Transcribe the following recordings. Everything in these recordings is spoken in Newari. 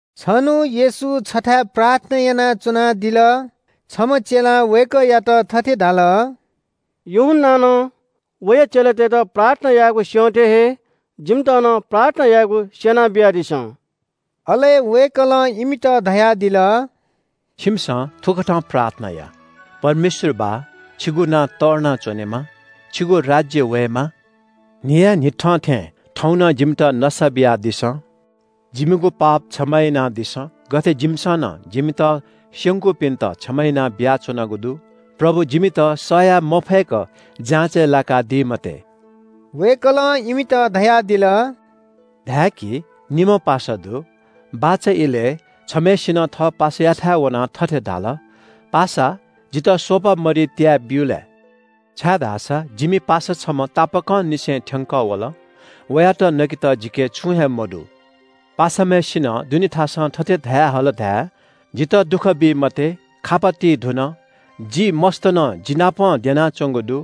छन्‍हु येशू छथाय् प्रार्थना यानाच्‍वनादिल। छम्‍ह चेलां वय्‌कःयात थथे धाल – “यूहन्‍नां नं वया चेलातय्‌त प्रार्थना यायेगु स्‍यं थें हे जिमित नं प्रार्थना यायेगु स्‍यनाबियादिसँ।” अले वय्‌कलं इमित धयादिल – “छिमिसं थुकथं प्रार्थना या – “‘परमेश्‍वर बाः छिगु नां तःधना च्‍वनेमा। छिगु राज्‍य वयेमा। न्‍हियान्‍हिथं थें थौं नं जिमित नसा बियादिसँ। जिमिगु पाप क्षमा यानादिसँ, गथे जिमिसं नं जिमित स्‍यंकूपिन्‍त क्षमा याना बियाच्‍वनागु दु। प्रभु, जिमित सह याये मफय्‌क जाँचय् लाकादी मते।’” वय्‌कलं इमित धयादिल – “धाय्‌की, निम्‍ह पासा दु। बाचा इलय् छम्‍हसिनं थः पासायाथाय् वनाः थथे धाल – ‘पासा, जितः स्‍वपा मरि त्‍याय् ब्‍यु लय्, छाय्‌धाःसा जिमि पासा छम्‍ह तापाकंनिसें थ्‍यंकः वल। वयात नकेत जिके छुं हे मदु।’ पासाम्‍हय्‌सिनं दुने थासं थथे धयाहल धाये – ‘जितः दुःख बी मते। खापा ति धुन। जि मस्‍त नं जिनापं द्यनाच्‍वंगु दु।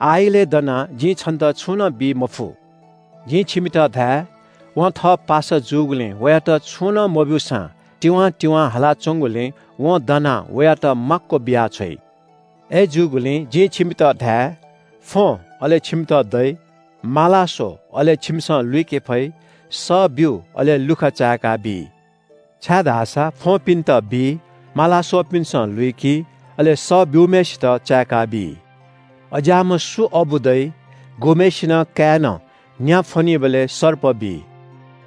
आः इलय् दनाः जिं छन्‍त छुं नं बी मफु।’ जिं छिमित धाये – वं थः पासा जूगुलिं वयात छुं नं मब्‍यूसां तिवां तिवां हालाच्‍वंगुलिं वं दनाः वयात माक्‍व बियाछ्वइ। “अय्‌जूगुलिं जिं छिमित धाये – फ्‍वँ, अले छिमित दइ, माला स्‍व, अले छिमिसं लुइके फइ, सः ब्‍यु, अले लुखा चाय्‌काबी। छाय्‌धाःसा फ्‍वंपिन्‍त बी, माला स्‍वःपिन्‍सं लुइकी, अले सः ब्‍यूम्‍हय्‌सित चाय्‌काबी। “अज्‍याःम्‍ह सु अबु दइ? गुम्‍हय्‌सिनं काय्‌नं न्‍या फ्‍वनीबलय् सर्प बी?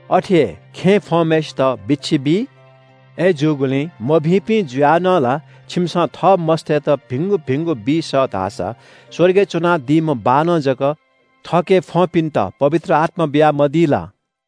अथे हे खेँय् फ्‍वंम्‍हय्‌सित बिच्‍छी बी? अय्‌जूगुलिं मभिंपिं जुयाः नं ला छिमिसं थः मस्‍तय्‌त भिंगु भिंगु बी सः धाःसा स्‍वर्गय् च्‍वनादीम्‍ह बाःनं जक थःके फ्‍वंपिन्‍त पवित्र आत्‍मा बियामदी ला?”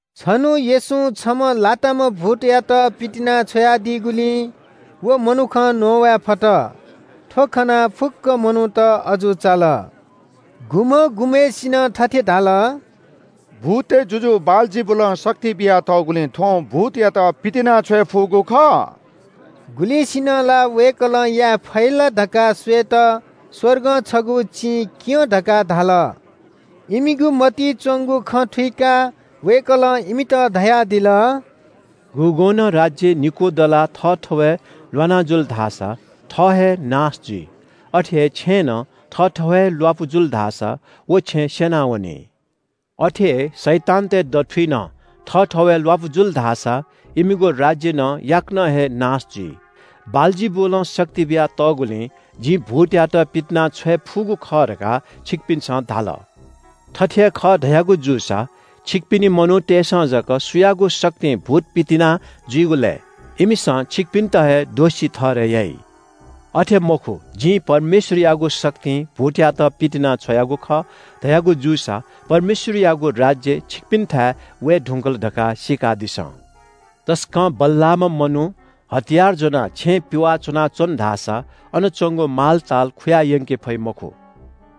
छन्‍हु येशूं छम्‍ह लाताम्‍ह भूतयात पितिना छ्वयादीगुलिं व मनुखं न्‍ववाये फत। थ्‍व खनाः फुक्‍क मनूत अजू चाल। गुम्‍हं गुम्‍हय्‌सिनं थथे धाल – “भूततय् जुजु बालजिबुलं शक्ति बियातःगुलिं थ्‍वं भूतयात पितिनाछ्वये फुगु खः।” गुलिंसिनं ला वय्‌कलं याये फइ ला धकाः स्‍वयेत स्‍वर्गं छगू चिं क्‍यँ धकाः धाल। इमिगु मतिइ च्‍वंगु खँ थुइकाः वय्‌कलं इमित धयादिल – “गुगुं नं राज्‍य निकू दलाः थःथवय् ल्‍वाना जुल धाःसा थः हे नाश जुइ। अथे हे छेँय् नं थःथवय् हे ल्‍वापु जुल धाःसा व छेँ स्‍यनावनी। अथे हे शैतानतय् दथुइ नं थःथवय् ल्‍वापु जुल धाःसा इमिगु राज्‍य नं याकनं हे नाश जुइ। बालजिबुलं शक्ति बियातःगुलिं जिं भूतयात पितिनाछ्वये फुगु खः धकाः छिकपिन्‍सं धाल। थथे हे खः धयागु जूसा छिकपिनि मनूतय्‌सं जक सुयागु शक्तिं भूत पितिना जुइगु लय्? इमिसं छिकपिन्‍त हे दोषी ठहरय् याइ। अथे मखु, जिं परमेश्‍वरयागु शक्तिं भूतयात पितिनाछ्वयागु खः धयागु जूसा परमेश्‍वरयागु राज्‍य छिकपिन्‍थाय् वये धुंकल धकाः सीकादिसँ। तसकं बल्‍लाःम्‍ह मनू हतियार ज्‍वनाः छेँ पिवाः च्‍वनाच्‍वन धाःसा अन च्‍वंगु मालताल खुया यंके फइ मखु।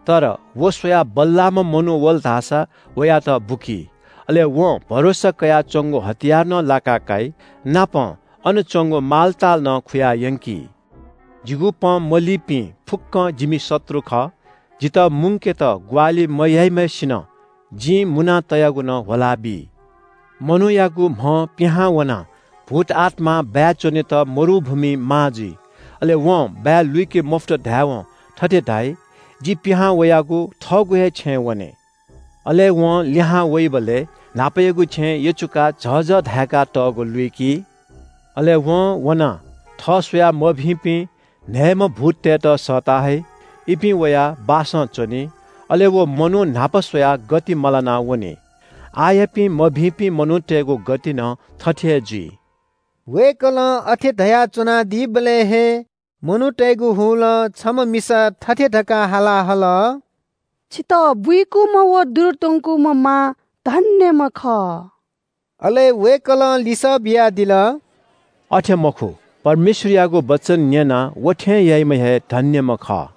तर व स्‍वयाः बल्‍लाःम्‍ह मनू वल धाःसा वयात बुकी। अले वं भरोसा कयाच्‍वंगु हतियार नं लाका काइ, नापं अन च्‍वंगु मालताल नं खुयायंकी। “जिगु पँ मलीपिं फुक्‍कं जिमि शत्रु खः। जितः मुंकेत ग्‍वाहालि मयाइम्‍हय्‌सिनं जिं मुना तयागु नं ह्वलाबी।” “मनूयागु म्‍हं पिहां वनाः भूतआत्‍मां बाय् च्‍वनेत मरुभूमिइ माः जुइ। अले वं बाय् लुइके मफुत धायेवं थथे धाइ – ‘जि पिहां वयागु थःगु हे छेँय् वने।’ अले वं लिहां वइबलय् न्‍हापायागु छेँ यचुकाः झःझः धाय्‌कातःगु लुइकी। अले वं वनाः थः स्‍वयाः मभिंपिं न्‍हय्‌म्‍ह भूततय्‌त सःता हइ। इपिं वयाः बासं च्‍वनी। अले व मनू न्‍हापा स्‍वयाः गति मलाना वनी। आःयापिं मभिंपिं मनूतय्‌गु गति नं थथे हे जुइ।” वय्‌कलं अथे धयाच्‍वनादीबलय् हे मनूतय्‌गु हुलं छम्‍ह मिसा थथे धकाः हाला हल – “छितः बुइकूम्‍ह व दुरु त्‍वंकूम्‍ह मां धन्‍यम्‍ह खः।” अले वय्‌कलं लिसः बियादिल – “अथे मखु, परमेश्‍वरयागु वचन न्‍यनाः व थें याइम्‍ह हे धन्‍यम्‍ह खः।”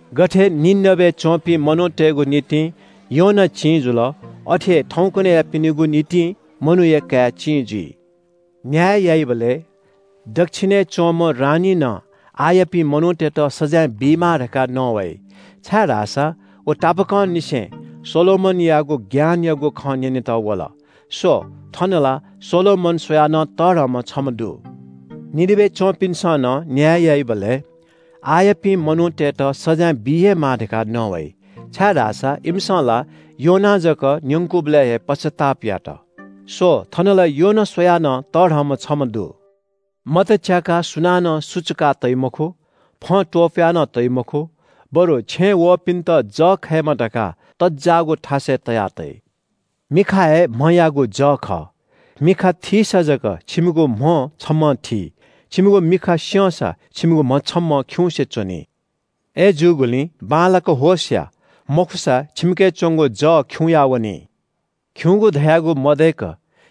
गथे निनवेय् च्‍वंपिं मनूतय्‌गु निंतिं योना चिं जुल, अथे हे थौंकन्‍हय्‌यापिनिगु निंतिं मनूया काय् चिं जुइ। “न्‍याय याइबलय् दच्‍छिनय् च्‍वंम्‍ह रानीं नं आःयापिं मनूतय्‌त सजाँय बीमाः धकाः नवाइ, छाय्‌धाःसा व तापाकंनिसें सोलोमनयागु ज्ञानयागु खँ न्‍यनेत वल। स्‍व, थन ला सोलोमन स्‍वयाः नं तःधंम्‍ह छम्‍ह दु। निनवेय् च्‍वंपिन्‍सं नं न्‍याय याइबलय् आःयापिं मनूतय्‌त सजाँय बी हे माः धकाः नवाइ, छाय्‌धाःसा इमिसं ला योनां जक न्‍यंकूबलय् हे पश्‍चाताप यात। स्‍व, थन ला योना स्‍वयाः नं तःधंम्‍ह छम्‍ह दु।” “मत च्‍याकाः सुनानं सुचुका तइ मखु, फं त्‍वपुया नं तइ मखु, बरु छेँय् वःपिन्‍त जः खयेमा धकाः तज्‍जाःगु थासय् तया तइ। “मिखा हे म्‍हयागु जः खः। मिखा थीसा जक छिमिगु म्‍ह छम्‍हं थी। छिमिगु मिखा स्‍यंसा छिमिगु म्‍ह छम्‍हं खिउँसे च्‍वनी। अय्‌जूगुलिं बांलाक होश या, मखुसा छिमिके च्‍वंगु जः खिउँया वनी। खिउँगु धयागु मदय्‌क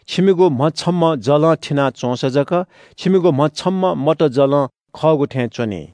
छिमिगु म्‍ह छम्‍हं जलं थिना च्‍वंसा जक छिमिगु म्‍ह छम्‍हं मत जलं खःगु थें च्‍वनी।”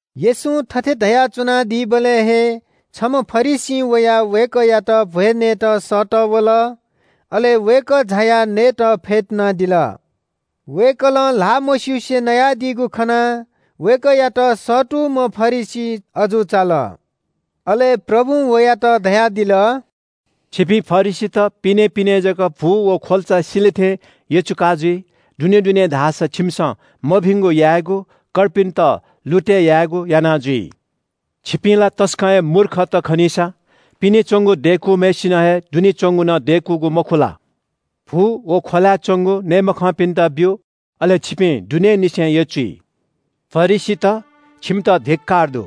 येशूं थथे धयाच्‍वनादीबलय् हे छम्‍ह फरिसीं वयाः वय्‌कःयात भ्‍वय् नयेत सःतः वल। अले वय्‌कः झायाः नयेत फ्‍यतुनादिल। वय्‌कलं ल्‍हाः मस्‍युसे नयादीगु खनाः वय्‌कःयात सःतूम्‍ह फरिसी अजू चाल। अले प्रभुं वयात धयादिल – “छिपिं फरिसीत पिनें पिनें जक भु व ख्‍वल्‍चा सिले थें यचुका जुइ। दुनें दुनें धाःसा छिमिसं मभिंगु यायेगु, कर्पिन्‍त लुतय् यायेगु याना जुइ। छिपिं ला तसकं हे मूर्खत खनीसा। पिने च्‍वंगु दय्‌कूम्‍हय्‌सिनं हे दुने च्‍वंगु नं दय्‌कूगु मखु ला? भु व ख्‍वलाय् च्‍वंगु नये मखंपिन्‍त ब्‍यु, अले छिपिं दुनेंनिसें यचुइ।” “फरिसीत, छिमित धिक्‍कार दु,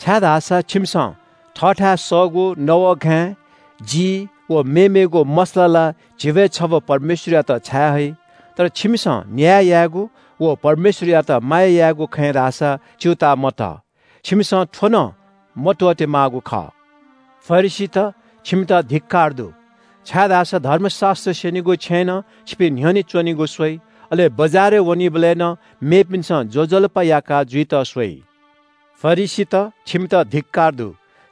छाय्‌धाःसा छिमिसं थःथाय् सःगु नवःघाँय्, जी व मेमेगु मसला ला झिब्‍वय् छब्‍व परमेश्‍वरयात छाये हइ। तर छिमिसं न्‍याय यायेगु व परमेश्‍वरयात माया यायेगु खँय् धाःसा च्‍यूताः मतः। छिमिसं थ्‍व नं मत्‍वःते माःगु खः। “फरिसीत, छिमित धिक्‍कार दु, छाय्‌धाःसा धर्मशास्‍त्र स्‍यनीगु छेँय् नं छिपिं न्‍ह्यःने च्‍वनेगु स्‍वइ, अले बजारय् वनीबलय् नं मेपिन्‍सं ज्‍वजलपा याका जुइत स्‍वइ। फरिसीत, छिमित धिक्‍कार दु,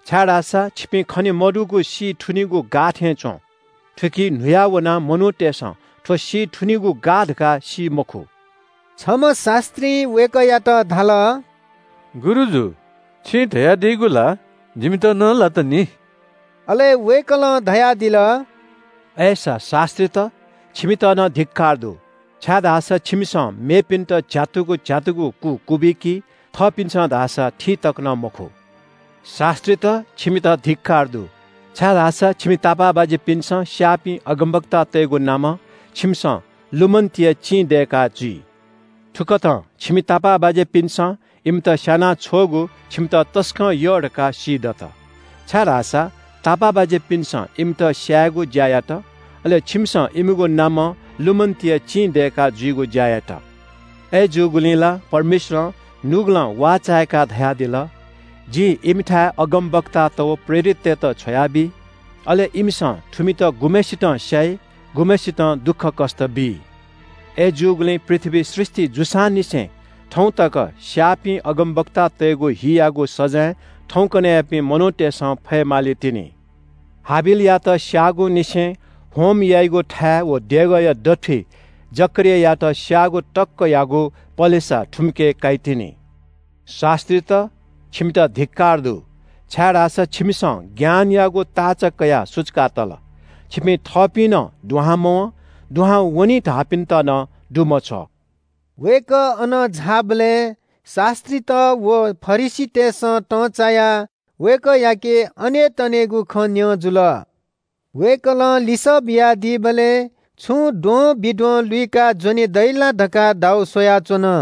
छाय्‌धाःसा छिपिं खने मदुगु सी थुनिगु गाः थें च्‍वं। थुकी न्‍हुया वनाः मनूतय्‌सं थ्‍व सी थुनिगु गाः धकाः सी मखु।” छम्‍ह शास्‍त्रीं वय्‌कःयात धाल – “गुरुजु छिं धयादीगु ला जिमित नं लात नि।” अले वय्‌कलं धयादिल – “अय्‌सा शास्‍त्रीत, छिमित नं धिक्‍कार दु, छाय्‌धाःसा छिमिसं मेपिन्‍त झ्‍यातुगु झ्‍यातुगु कु क्‍वबिकी, थःपिन्‍सं धाःसा थी तक नं मखु। शास्‍त्रीत, छिमित धिक्‍कार दु, छाय्‌धाःसा छिमि तापाःबाज्‍यापिन्‍सं स्‍याःपिं अगमवक्तातय्‌गु नामं छिमिसं लुमन्‍तिया चिं दय्‌का जुइ। थुकथं छिमि तापाःबाज्‍यापिन्‍सं इमित स्‍याना छ्वःगु छिमित तसकं यः धकाः सीदत, छाय्‌धाःसा तापाःबाज्‍यापिन्‍सं इमित स्‍यायेगु ज्‍या यात, अले छिमिसं इमिगु नामं लुमन्‍तिया चिं दय्‌का जुइगु ज्‍या यात। अय्‌जूगुलिं ला परमेश्‍वरं नुगलं वाःचाय्‌काः धयादिल – ‘जिं इमिथाय् अगमवक्तात व प्रेरिततय्‌त छ्वयाबी। अले इमिसं थुमित गुम्‍हय्‌सितं स्‍याइ, गुम्‍हय्‌सितं दुःखकष्‍ट बी।’ “अय्‌जूगुलिं पृथ्‍वी सृष्‍टि जूसांनिसें थौं तक स्‍याःपिं अगमवक्तातय्‌गु हियागु सजाँय थौंकन्‍हय्‌यापिं मनूतय्‌सं फये मालीतिनि। हाबिलयात स्‍याबलय्‌ निसें होम याइगु थाय् व देगःया दथुइ जकरियायात स्‍याःगु तकयागु पलेसा थुमिके काइतिनि। “शास्‍त्रीत, छिमित धिक्‍कार दु, छाय्‌धाःसा छिमिसं ज्ञानयागु ताःचा कयाः सुचुका तल। छिपिं थःपिं नं दुहां मवं, दुहां वने धाःपिन्‍त नं दुमछ्वः।” वय्‌कः अनं झाःबलय् शास्‍त्रीत व फरिसीतय्‌सं तंचायाः वय्‌कःयाके अनेतनेगु खँ न्‍यं जुल। वय्‌कलं लिसः बियादीबलय् छुं द्वंबिद्वं लुइकाः ज्‍वने दइ ला धकाः दाउ स्‍वयाच्‍वन।